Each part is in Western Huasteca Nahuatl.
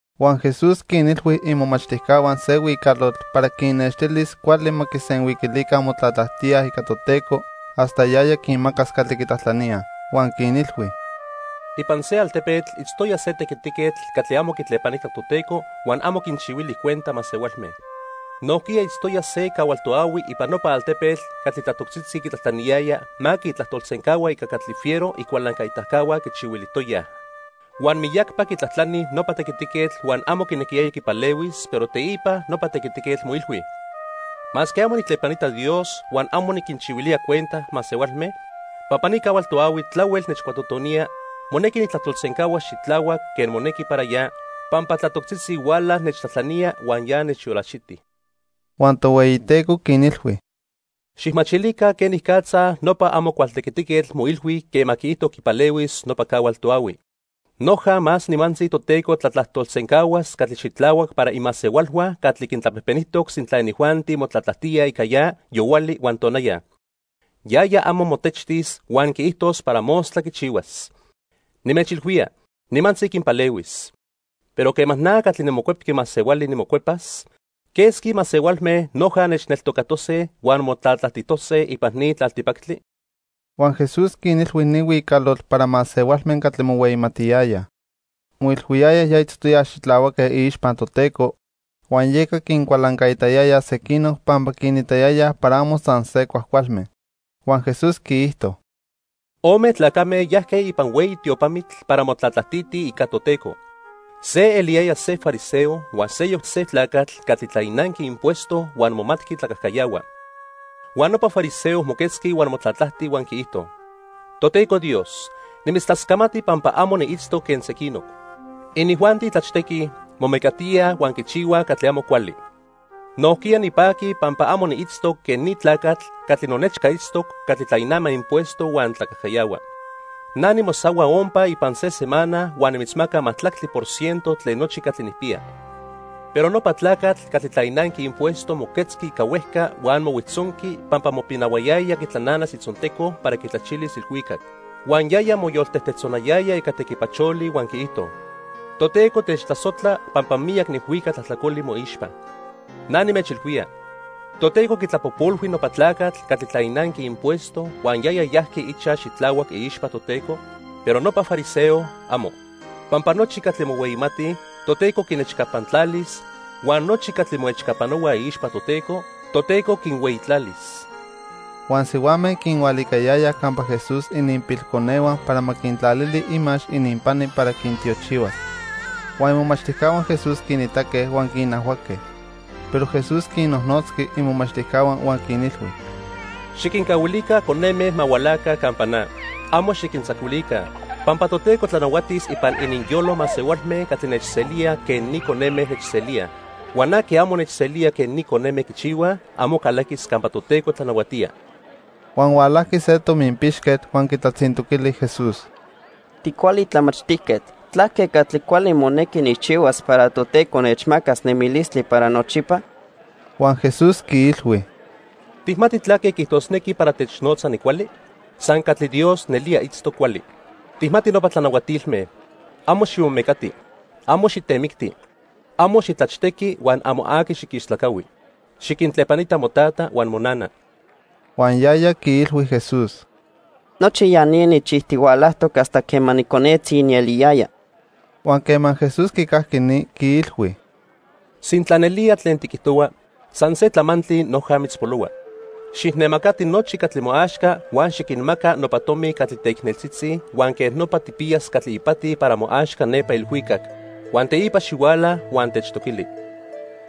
Huan Jesús quinilhui imomachtijcahua se huicalotl para quinnextilis cuali ma quisenhuiquilica motlatlajtía ica Toteco hasta yaya quinmacas catli quitlajtlaníaj. Huan quinilhui: "Ipan se altepetl itztoya se tequitiquetl catli amo quitlepanitac Toteco huan amo quinchihuili cuenta masehualme. Nojquiya itztoya se cahual toahui ipan nopa altepetl catli tlatoctzitzi quitlajtlaniyaya ma quitlajtolsencahua ica catli fiero icualancaitacahua quichihuilijtoyaj. Huan miyacpa quitlajtlani nopa tequitiquetl huan amo quinequiyaya quipalehuis, pero teipa nopa tequitiquetl moilhui: 'Masque amo nijtlepanita Dios huan amo niquinchihuilía cuenta masehualme, pampa ni cahual toahui tlahuel nechcuatotonía, monequi nijtlajtolsencahuas xitlahuac quen monequi para ya, pampa tlatoctzitzi huala nechtlajtlanía huan ya nechyolaxiti.' " Huan Tohueyiteco quinilhui: "Xijmachilica quenicatza nopa amo cual tequitiquetl moilhui quema quiijto quipalehuis nopa cahual toahui. Noja más nimantzi Toteco tlatlajtolsencahuas catli xitlahuac para imasehualhua catli quintlapejpenijtoc sintla inijuanti motlatlajtíaj ica ya yohuali huan tonaya. Yaya amo motechtis huan quiijtos para mostla quichihuas. Nimechilhuía, nimantzi quinpalehuis. Pero quema na catli niMocuepqui Masehuali nimocuepas, ¿quesqui masehualme noja nechneltocatose huan motlatlajtijtose ipan ni tlaltipactli?" Huan Jesús quinilhui ni huicalotl para masehualme catli mohueyimatiyayaj. Moilhuiyayaj ya itztoyaj xitlahuaque iixpa Toteco, huan yeca quincualancaitayayaj sequinoc pampa quinitayayaj para amo san se cuajcualme. Huan Jesús quiijto: "Ome tlacame yajque ipan hueyi tiopamitl para motlatlajtitij ica Toteco. Se eliyaya se fariseo huan seyoc se tlacatl catli tlainanqui impuesto huan momatqui tlacajcayahua. Huan nopa fariseo moquetzqui huan motlatlajti huan quiijto: 'Toteco Dios, nimitztlascamati pampa amo niitztoc quen sequinoc. Inijuanti tlachtequij, momecatíaj huan quichihuaj catli amo cuali. Nojquiya nipaqui pampa amo niitztoc quen ni tlacatl catli nonechca itztoc catli tlainama impuesto huan tlacajcayahua. Na nimosahua ompa ipan se semana huan nimitzmaca majtlactli por ciento tlen nochi catli nijpiya.' Pero nopa tlacatl catli tlainanqui impuesto moquetzqui ica huejca huan mohuijtzonqui pampa mopinahuayaya quitlananas itzonteco para quitlachilis ilhuicac. Huan yaya moyoltejtejtzonayaya ica tequipacholi huan quiijto: 'Toteco techtlasojtla pampa miyac nijhuica tlajtlacoli moixpa.' Na nimechilhuía, Toteco quitlapojpolhui nopa tlacatl catli tlainanqui impuesto huan yaya yajqui ichaj xitlahuac iixpa Toteco, pero nopa fariseo, amo. Pampa nochi catli mohueyimatij, Toteco quinechcapantlalis huan nochi catli moechcapanohuaj iixpa Toteco, Toteco quinhueyitlalis." Huan sihuame quinhualicayayaj campa Jesús ininpilconehua para ma quintlalili imax ininpani para quintiochihuas. Huan imomachtijcahua Jesús quinitaque huan quinajhuaque. Pero Jesús quinnojnotzqui imomachtijcahua huan quinilhui: —Xiquincahuilica coneme ma hualaca campa na. Amo xiquintzacuilica, pampa Toteco tlanahuatis ipan ininyolo masehualme catli nechselíaj quen ni coneme nechselíaj. Huan aqui amo nechselía quen ni coneme quichihuaj, amo calaquis campa Toteco tlanahuatía. Huan hualajqui se tominpixquetl huan quitlatzintoquili Jesús: —Ticuali tlamachtijquetl, ¿tlaque catli cuali monequi nijchihuas para Toteco nechmacas nemilistli para nochipa? Huan Jesús quiilhui: —¿Tijmati tlaque quiijtosnequi para technotza nicuali? San catli Dios nelía itztoc cuali. Tijmati nopa tlanahuatilme: 'Amo ximomecati, amo xitemicti, amo xitlachtequi huan amo aqui xiquistlacahui. Xiquintlepanita motata huan monana.' Huan yaya quiilhui Jesús: —Nochi ya ni nijchijtihualajtoc hasta quema niconetzi nieliyaya. Huan quema Jesús quicajqui ni, quiilhui: —Sintla nelía tlen tiquijtohua, san se tlamantli noja mitzpolohua. Xijnemacati nochi catli moaxca huan xiquinmaca nopa tomi catli teicneltzitzi huan quej nopa tijpiyas catli ipati para moaxca nepa ilhuicac. Huan teipa xihuala huan techtoquili.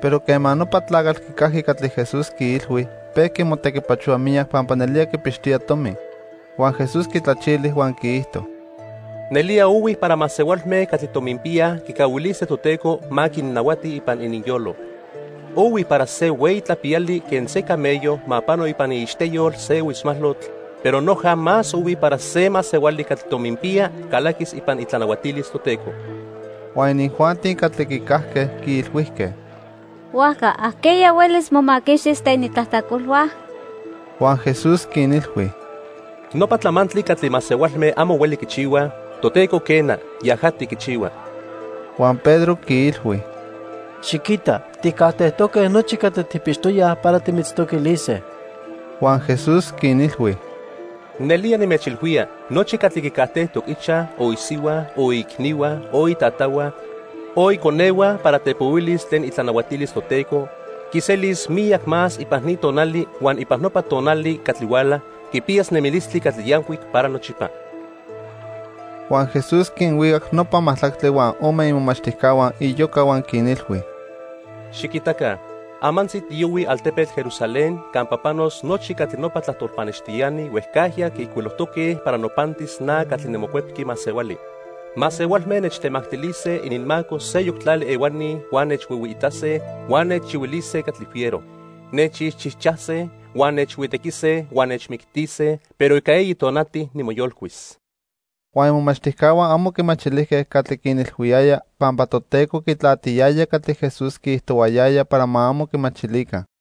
Pero quema nopa tlacatl quicajqui catli Jesús quiilhui, pejqui motequipachohua miyac pampa nelía quipixtoya tomi. Huan Jesús quitlachili huan quiijto: —Nelía ohui para masehualme catli tominpiyaj quicahuilise Toteco ma quinnahuati ipan ininyolo. Ohui para se hueyi tlapiyali quen se camello ma pano ipan iixteyol se huitzmalotl, pero noja más ohui para se masehuali catli tominpiya calaquis ipan itlanahuatilis Toteco. Huan inijuanti catli quicajque quiilhuijque: —Huajca ¿ajqueya huelis momaquixtis tlen itlajtlacolhua? Huan Jesús quinilhui: —Nopa tlamantli catli masehualme amo hueli quichihuaj, Toteco quena, yajati quichihua. Huan Pedro quiilhui: —Xiquita, tijcajtejtoque nochi catli tijpixtoyaj para timitztoquilise. Huan Jesús quinilhui: —Nelía nimechilhuía nochi catli quicajtejtoc ichaj, o isihua, o iicnihua, o itatahua o iconehua para tepohuilis tlen itlanahuatilis Toteco, quiselis miyac más ipan ni tonali huan ipan nopa tonali catli huala, quipiyas nemilistli catli yancuic para nochipa. Huan Jesús quinhuicac nopa majtlactli huan ome imomachtijcahua iyoca huan quinilhui: "Xiquitaca, amantzi tiyohuij altepetl Jerusalén campa panos nochi catli nopa tlajtol pannextiani huejcajya quiijcuilojtoque para nopantis na catli niMocuepqui Masehuali. Masehualme nechtemactilise ininmaco seyoc tlali ehuani huan nechhuihuiitase huan nechchihuilise catli fiero. Nechixchijchase, huan nechhuitequise huan nechmictise, pero ica eyi tonati nimoyolcuis." Huan imomachtijcahua amo quimachilijque catli quinilhuiyaya pampa Toteco quitlatiyaya catli Jesús quiijtohuayaya para ma amo quimachilica.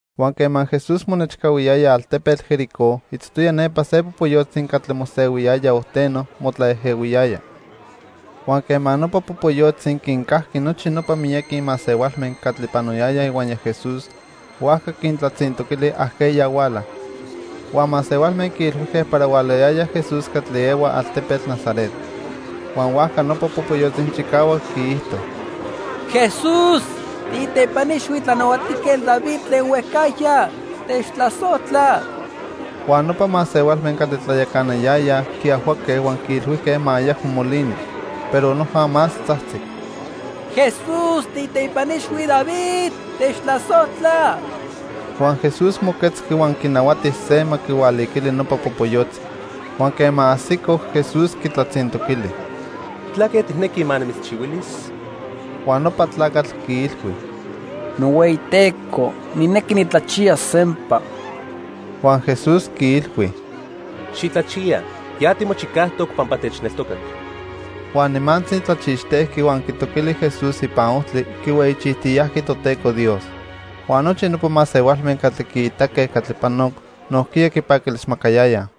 Huan quema Jesús monechcahuiyaya altepetl Jericó, itztoya nepa se popoyotzi catli mosehuiyaya ojteno motlaejehuiyaya. Huan quema nopa popoyotzi quincajqui nochi nopa miyaqui masehualme catli panoyayaj ihuaya Jesús, huajca quintlatzintoquili ajqueya huala. Huan masehualme quiilhuijque para hualayaya Jesús catli ehua altepetl Nazaret. Huan huajca nopa popoyotzi chicahuac quiijto: —¡Jesús, tiiteipa ixhui Tlanahuatijquetl David tlen huejcajya, techtlasojtla! Huan nopa masehualme catli tlayacanayayaj quiajhuaque huan quiilhuijque ma ayacmo molini, pero noja más tzajtzic: —¡Jesús tiiteipa ixhui David, techtlasojtla! Huan Jesús moquetzqui huan quinahuati se ma quihualiquili nopa popoyotzi. Huan quema ajsico, Jesús quitlatzintoquili: —¿Tlaque tijnequi ma nimitzchihuilis? Huan nopa tlacatl quiilhui: —NohueyiTeco, nijnequi nitlachiyas sempa. Huan Jesús quiilhui: —¡Xitlachiya! Ya timochicajtoc pampa techneltocac. Huan nimantzi tlachixtejqui, huan quitoquili Jesús ipan ojtli, quihueyichijtiyajqui Toteco Dios. Huan nochi nopa masehualme catli quiitaque catli panoc nojquiya quipaquilismacayayaj.